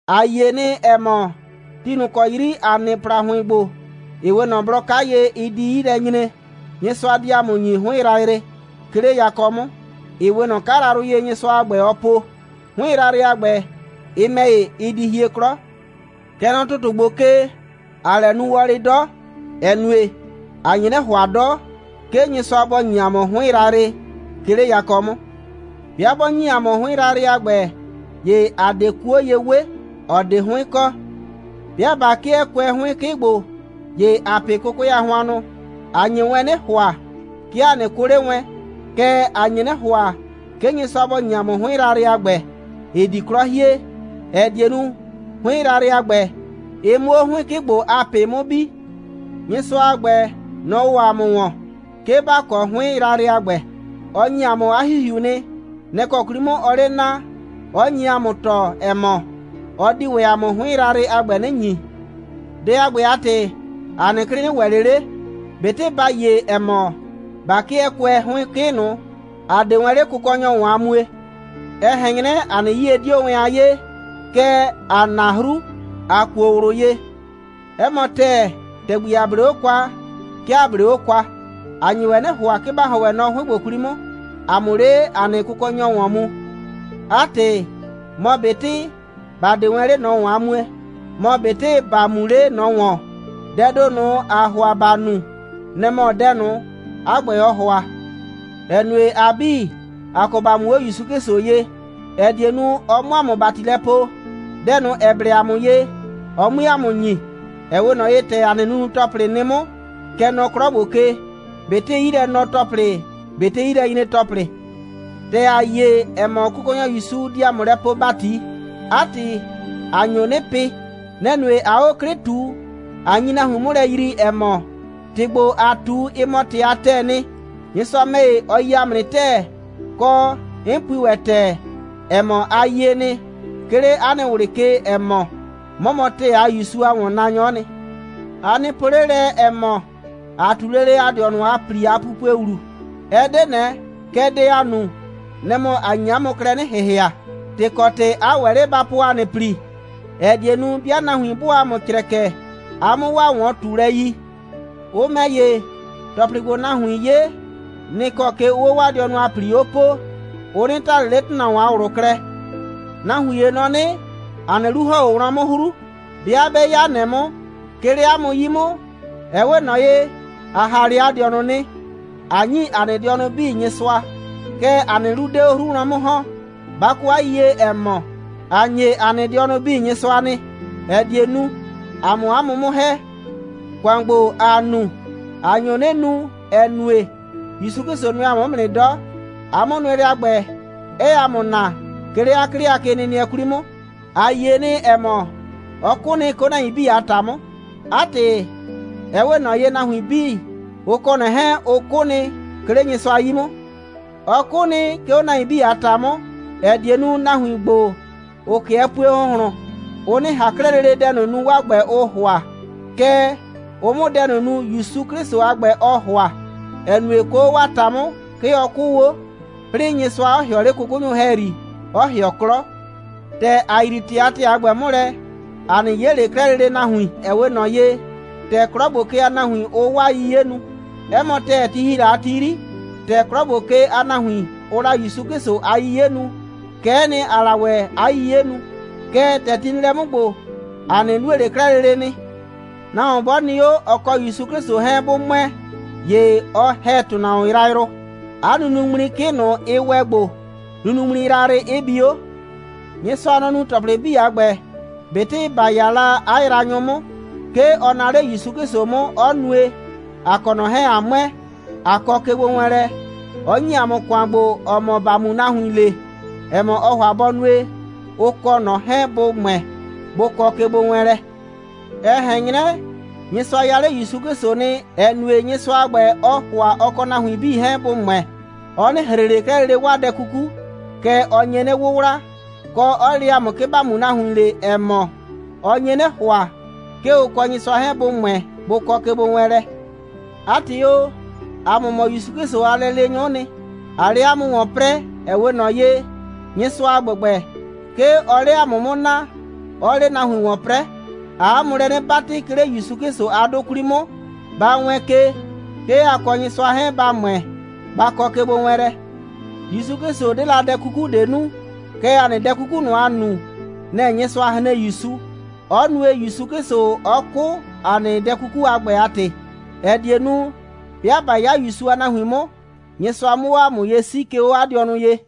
‑A yie nɩ, ‑ɛ mɔ, ti ꞊nʋ ‑kɔ 'yri ‑a nɩ ‑plahʋɩn ‑gbo, ‑ɩ 'we ꞊nɔ blɔ 'ka ye, ɩ di 'yi lɛ nyre, Nyɩsʋa di ‑a mʋ ‑nyi 'hʋɩn yrayrɩ, 'ke 'le yakɔ 'mʋ, ‑ɩ 'we ꞊nɔ 'kayrayrʋ ye, Nyɩsʋa a ‑gbɛ, ɔ po. 'Hʋɩn yrayrɩ a ‑gbɛ, ɩ ‑mɛ ‑ye, ɩ di hie 'klɔ. Kɛ nɔ ‑tʋtʋ ‑gbo ke, ‑aa lɛ nu wɔlɩ 'dɔ, ‑ɛ nue, ‑a nye 'nɩ ‑hʋa 'dɔ, 'ke Nyɩsʋa bɔ ‑nyi ‑a mʋ 'hʋɩn yrayrɩ, 'ke 'le yakɔ 'mʋ. 'Bɩa 'bɔ ‑nyi ‑a mʋ 'hʋɩn yrayrɩ a ‑gbɛ, ‑ye ‑a 'de 'kuo ye 'we, ‑ɔ 'de 'hʋɩn kɔ. 'Bɩa ꞊ba 'kɩɛ kʋɛ 'hʋɩn 'kɩ ‑gbo, ‑ye ‑aa pɩ 'kʋkʋɛ a hʋannʋ. ‑A nye wɛn 'nɩ ‑hʋa, 'ke ‑a 'nɩ 'kʋ 'le wɛn. Kɛɛ, ‑a nye 'nɩ ‑hʋa, 'ke Nyɩsʋa bɔ ‑nyi ‑a mʋ 'hʋɩn yrayrɩ a ‑gbɛ, ‑ɩ di 'klɔ hie, ‑ɛ die nu, 'hʋɩn yrayrɩ a ‑gbɛ, ɩ 'mʋ 'o 'hʋɩn 'kɩ ‑gbo a ꞊pɩ 'mʋ bi. Nyɩsʋa a ‑gbɛ, nɔ‑ ‑wɔ ‑a mʋ ‑wɔn, 'ke ‑ba kɔ 'hʋɩn yrayrɩ a ‑gbɛ. Ɔ ‑nyi ‑a mʋ 'a ‑Hihiu nɩ. Nɛ‑ kɔ 'kwli 'mʋ, ɔɔ 'le naa, 'ɔ nye ‑a mʋ tɔɔ, ‑ɛ mɔ, ɔ di ‑wɛ ‑a mʋ 'hʋɩn yrayrɩ a ‑gbɛ 'nɩ ‑nyi. Dɛ a ‑gbɛ a ‑tɩ, ‑a nɩ 'klɩ 'nɩ ‑wɛ ꞊le 'le, ꞊betɩ ‑ba yie, ‑ɛ mɔ, ꞊ba 'kɩɛ kʋɛ 'hʋɩn 'kɩ ꞊nʋ, ‑a 'de wɛn 'le Kʋkɔnyɔ ‑wɔn a mue. Ɛ ꞊hɛn 'nyrɛ, ‑a nɩ 'yie 'dio wɛn a 'yee, kɛɛ, ‑aa na 'hru, ꞊a kuo ꞊wlʋ ye. 'Ɛ mɔ ‑tɛɛ, ‑tɛgbi ‑a 'blee 'o kwa, 'ke ‑a 'blee 'o kwa. ‑A nye wɛn 'nɩ ‑hʋa, 'ke ‑ba ‑hɔn wɛn nɔ 'hʋɩn ‑gbo 'kwli 'mʋ, ‑a 'mʋ 'le ‑a nɩ Kʋkɔnyɔ ‑wɔn mu. 'A ‑tɩ, mɔ ꞊betɩ ‑ba 'de wɛn 'le ꞊nɔ ‑wɔn a mue, mɔ ꞊betɩ ‑ba mu 'le ꞊nɔ ‑wɔn, dɛɛ ‑do ꞊nʋ, ‑aa ‑hʋa ‑ba nu, nɛ‑ mɔ dɛ ꞊nʋ, 'a ‑gbɛ, ɔɔ ‑hʋa, ‑ɛ nue, ‑a 'bii, ‑a kɔ ‑ba mu 'o ‑Yusu 'Klɩsʋ ye, ‑ɛ die nu, ɔ 'mʋ ‑a mʋ ‑bati lɛ poo, dɛ ꞊nʋ, ‑ɛ blɛ ‑a mʋ ye, ɔ 'mue ‑a mʋ ‑nyi, ‑ɛ 'we ꞊nɔ ye, ‑tɛ ‑a nɩ nunu‑tɔplɩ nɩ 'mʋ, kɛ nɔ 'klɔ ‑gbo ke, ꞊betɩ 'yilɛnɔ‑tɔplɩ, ꞊betɩ 'yilɛnyre‑tɔplɩ. ‑Tɛ ‑a yie, ‑ɛ mɔ, Kʋkɔnyɔ ‑Yusu di ‑a mʋ lɛ poo ‑bati, 'a ‑tɩ, ‑a nyo 'nɩ pɩ. Nɛ‑ nue, ꞊aa 'o 'klɩ ꞊tu, ꞊a nyi nahuin 'mʋ lɛ yrii, ‑ɛ mɔ, ‑tɩ ‑gbo, ‑aa ꞊tu, ɩ mɔ ‑tɩ a ‑tɛɛ nɩ. Nyɩsʋa ‑mɛ ‑ye, ɔ yi ‑a mʋ nɩ ‑tɛɛ, kɔ, 'n pui ‑wɛ ‑tɛɛ, ‑ɛ mɔ, a yie nɩ, 'ke 'le 'a nɩ ꞊wlɩ ke, ‑ɛ mɔ, 'mɔ mɔ ‑tɛɛ a ‑Yusu a ‑wɔnnaanyɔ'ɔ nɩ. A nɩ po 'le lɛ, ‑ɛ mɔ, ‑a ꞊tu lele ‑a dɩɔnʋ a ‑pli a pupue ‑wlu. Ɛ 'de ꞊nɛ. Kɛɛ, dɛ ‑aa nu, nɛ‑ mɔ, ‑a nye 'a mʋ klɛ 'nɩ ‑hɩhɩa, ‑tɩ kɔ ‑tɩ 'a ‑wɛ 'le ba po ‑a nɩ ‑pli, ‑ɛ die nu, 'bɩa nahuin 'bʋʋ ‑a mʋ crɛkɛ, a 'mʋ 'waa ‑wɔn꞊tulɛ yi. Ʋ ‑mɛ ‑ye, ‑tɔplɩ ‑gbo, nahuiin 'ye, nɩ‑ kɔ ke ʋʋ 'o 'waa dɩɔnʋ a ‑pli 'o poo. Ʋ 'nɩ ta ꞊le 'le ‑tʋnahuon a ꞊wlʋ klɛ. Nahuin ‑ye nɔ 'nɩ, ‑a nɩ 'lu ‑hɔn 'o wlɔn 'mʋ 'hru. 'Bɩa 'bɛ 'ya ꞊nɛ 'mʋ, 'ke 'le 'a mʋ 'yi 'mʋ, ɛ 'we ꞊nɔ ye, ‑a ‑ha 'le ‑a dɩɔnʋ nɩ, ꞊a ‑nyi ‑a nɩ dɩɔnʋ 'bii Nyɩsʋa. Kɛɛ, ‑a nɩ 'lu 'de 'o 'hru wlɔn 'mʋ ‑hɔn. Ba kɔ 'a yiyie, ‑ɛ mɔ, ‑a ‑nye ‑a nɩ dɩɔnʋ 'bii Nyɩsʋa nɩ, ‑ɛ die nu, ‑a 'mʋ 'a mʋ 'mʋ ‑hɛ. ‑Kʋan ‑gbo, ‑aa nu, ‑a nyo 'nɩ nu, ‑ɛ nue, ‑Yusu 'Klɩsʋ nʋɛ ‑a mʋ 'mʋ nɩ 'dɔ, 'a 'mʋnʋɛlɛ a ‑gbɛ, 'ɛɛ ‑a mʋ naa, 'ke 'le 'a 'klɩ a kenɩnɩɛ 'kwli 'mʋ. ‑A yie nɩ, ‑ɛ mɔ, ɔ 'kʋ nɩ, 'ke 'o nahuin 'bii a ‑ta 'mʋ. 'A ‑tɩ, ɛ 'we ꞊nɔ ye, nahuin 'bii, ʋ kɔ ꞊nɔ 'hɛɛn, ʋ 'kʋ nɩ, 'ke 'le Nyɩsʋa 'yi 'mʋ. Ɔ 'kʋ nɩ, 'ke 'o nahuin 'bii a ‑ta 'mʋ, ‑ɛ die nu, nahuin ‑gbo, ‑ʋ 'kɩɛ pue ‑hʋnhlʋn, ʋ 'nɩ ꞊han 'klɛɛ lele dɛ ꞊nʋ nu, 'waa ‑gbɛ, ʋʋ ‑hʋa, kɛɛ, ʋ 'mʋ dɛ ꞊nʋ nu, ‑Yusu 'Klɩsʋ a ‑gbɛ, ɔɔ ‑hʋa, ‑ɛ nue, 'ke 'o 'waa ‑ta 'mʋ, 'ke ɔ 'kʋʋ 'o, 'plɩɩ Nyɩsʋa 'ɔ ‑hɩɔ 'le 'kʋkʋnyʋ ‑hɛyri, 'ɔ ‑hɩɔ 'klɔ. ‑Tɛ ‑a yrii ‑tɩ a ‑tɛɛ a ‑gbɛ 'mʋ lɛ, ‑a 'nɩ 'ye ꞊le 'klɛɛ lele nahuin, ‑ɛ 'we ꞊nɔ ye, ‑tɛ 'klɔ ‑gbo ke a nahuin, ʋʋ 'waa 'yiye nu. 'Ɛ mɔ ‑tɛɛ, ti ‑hi la a ti 'yri, ‑tɛ 'klɔ ‑gbo ke a nahuin, ʋʋ la ‑Yusu 'Klɩsʋ a 'yiye nu, kɛ'ɛ nɩ, ‑aa la ‑wɛ 'a 'yiye nu. Kɛɛ, ‑tɛ ti nɩ lɛ 'mʋ ‑gbo, ‑a 'nɩ nue ꞊le 'klɛɛ lele nɩ. Nahuon 'bɔ nɩ 'o, ɔ kɔ ‑Yusu 'Klɩsʋ 'hɛɛn 'bʋ ‑mʋɛ, ‑ye ɔ ‑hɛ ‑tʋnahuon yrayrʋ. 'A nunuŋmli 'kɩ ꞊nʋ, ɩ ‑wɛ gbo, nunuŋmli yrayrɩ 'ɩ bi 'o. Nyɩsʋa, nɔ‑ nu ‑tɔplɩ 'bii a ‑gbɛ. ꞊Betɩ ‑ba 'ya la 'a yraanyʋ 'mʋ, 'ke ɔ naa 'le ‑Yusu 'Klɩsʋ 'mʋ, 'ɔ nue, ‑a kɔ ꞊nɔ 'hɛɛn, ꞊a ‑mʋɛ, ꞊a kɔ kegbowɛɛnlɛ, 'ɔ ‑nyi ‑a mʋ ‑kʋan ‑gbo, ‑ɔ mɔ ‑ba mu nahuin le, ‑ɛ mɔ, ɔɔ ‑hʋa bɔ nue, ʋ kɔ ꞊nɔ 'hɛɛn bʋ ‑mʋɛ, bʋ kɔ kegbowɛɛnlɛ. Ɛ ꞊hɛn 'nyrɛ, Nyɩsʋa ya 'le ‑Yusu 'Klɩsʋ nɩ, ‑ɛ nue, Nyɩsʋa a ‑gbɛ, ɔɔ ‑hʋa ɔ kɔ nahuin 'bii 'hɛɛn bʋ ‑mʋɛ. Ɔ 'nɩ ‑hre ꞊le 'klɛɛ lele 'waa dɛ 'kuku, kɛɛ, ɔ nye 'nɩ 'wʋwla, kɔ, 'ɔ le ‑a mʋ, 'ke ‑ba mu nahuin le, ‑ɛ mɔ, ɔ nye 'nɩ ‑hʋa, 'ke ʋ kɔ Nyɩsʋa 'hɛɛn bʋ ‑mʋɛ, bʋ kɔ kegbowɛɛnlɛ. 'A ‑tɩ o, ‑a mʋ mɔ ‑Yusu 'Klɩsʋ a lɛleenyʋ'ʋ nɩ, ꞊aa 'le 'a mʋ ‑wɔn 'prɛɛ. Ɛ 'we ꞊nɔ ye, Nyɩsʋa a ‑gbɛgbɛ, 'ke ɔɔ 'le ‑a mʋ 'mʋ naa, 'ɔɔ 'le nahuin ‑wɔn 'prɛɛ. ‑Aa 'a mʋ lɛ 'nɩ 'batɩ, 'ke 'le ‑Yusu 'Klɩsʋ a 'dʋ 'kwli 'mʋ, ba wɛɛn ke, 'ke a kɔ Nyɩsʋa 'hɛɛn, ba ‑mʋɛ, ba kɔ kegbowɛɛnlɛ. ‑Yusu 'Klɩsʋ 'de la dɛ 'kuku ꞊de nu, kɛɛ, ‑a nɩ dɛ 'kuku ꞊nʋ, ‑a nu, nɛ‑ Nyɩsʋa hren ‑Yusu, 'ɔ nue, ‑Yusu 'Klɩsʋ 'ɔ 'kʋ ‑a nɩ dɛ 'kuku a ‑gbɛ a ‑tɩ, ‑ɛ die nu, 'bɩa ꞊ba 'ya ‑Yusu a nahuin 'mʋ, Nyɩsʋa 'mʋ 'o ‑a mʋ ye 'sii, 'ke 'o 'a dɩɔnʋ ye.